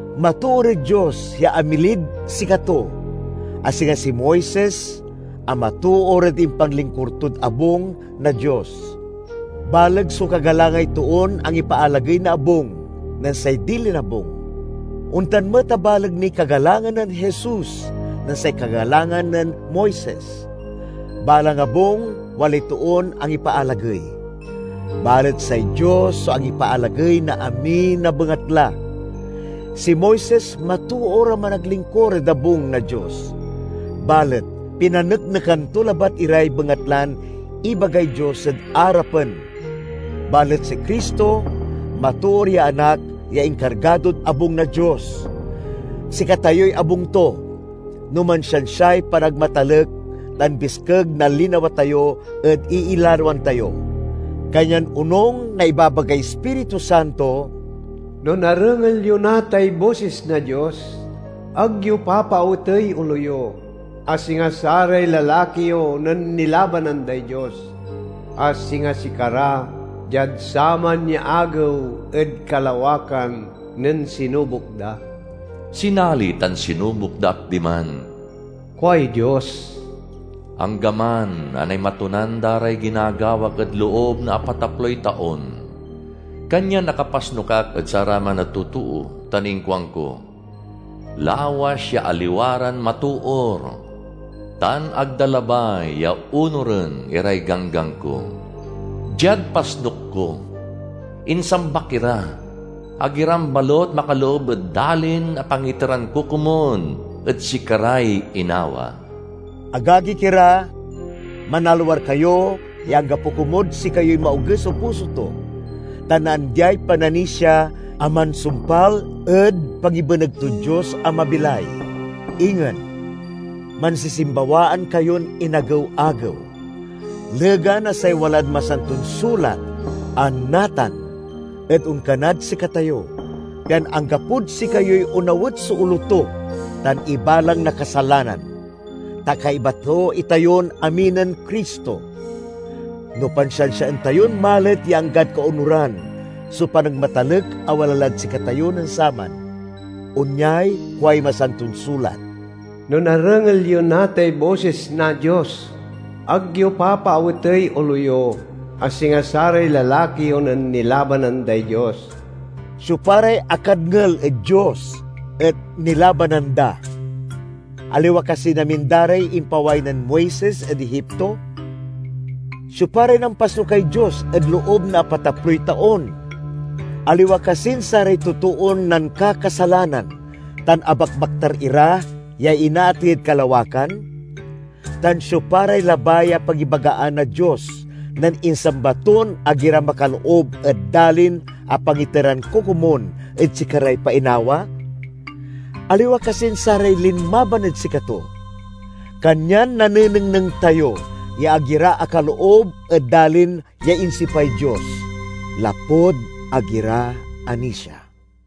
Matoor ed Dios ya amilid sikato, a singa si Moises a matoor ed impanlingkur tod abung na Dios. Baleg so kagalangay toon angipaalagey na abung nen say dilin abung. Ontan met a baleg niy kagalangan nen Jesus nen say kagalangan nen Moises. Balang abung walay toon angipaalagey, balet say Dios so angipaalagey na amin a bengatla. Si Moises matoor a managlingkur ed abung na Dios, balet pinaneknekan to labat iray bengatlan ibagay Dios ed arapen. Balet si Cristo matoor ya Anak ya inkargadod abung na Dios. Sikatayoy abung to, no mansiansiay panagmatalek tan biskeg na linawa tayo ed iilaloan tayo. Kanyan onung na ibabagay Ispiritu Santo: "No narengel yo natay bosis na Dios, ag yo papaawetey olo yo, a singa saray lalaki yo nen nilabanan day Dios, a singa sikara diad saman ya agew ed kalawakan nen sinubok da. Sinali tan sinubok da ak diman, kuay Dios, anggaman a naimatunan da ray ginagawak ed loob na apataploy taon. Kanyan akapasnuk ak ed saraman a totoo tan inkuanko, 'Lawas ya aliwa ran matoor tan ag da labay ya onuren iray ganggan ko.' Diad pasnuk ko, insambak ira, 'Ag iran balut makaloob ed dalin a pangiteran ko komun ed sikaray inawa.'" Agagik ira, manalwar kayo ya anggapo komud sikayoy maoges so puso to tan naandiay pananisia a mansumpal ed pangibeneg tod Dios a mabilay. Ingen, mansisimbawaan kayon inagew-agew, legan a say walad Masanton Sulat a "Natan" et onkanad sikatayo, pian anggapod sikayoy onawet so olo to tan ibalang na kasalanan. Ta kaiba to itayon amin nen Cristo, no pansiansiaen tayon malet ya anggad kaonuran so panagmatalek a wala lad sikatayo nen saman. Onyay kuay masanton sulat, "No narengel yo natay bosis na Dios, ag yo papaawetey olo yo, a singa saray lalaki yo nen nilabanan day Dios." Siopa ray akadngel ed Dios et nilabanan da? Aliwa kasin amin da ray impaway nen Moises ed Egipto? Siopa ray nampasnukay Dios ed loob na apataploy taon? Aliwa kasin saray totoon nankakasalanan tan abakbaktar ira ya inaatey ed kalawakan? Tan siopa ray labay a pangibagaan na Dios nen insamba ton ag ira makaloob ed dalin a pangiteran ko komun ed sikaray painawa? Aliwa kasin saray linmaban ed sikato? Kanyan nanenengneng tayo ya ag ira akaloob ed dalin ya insipay Dios, lapud ag ira anisia.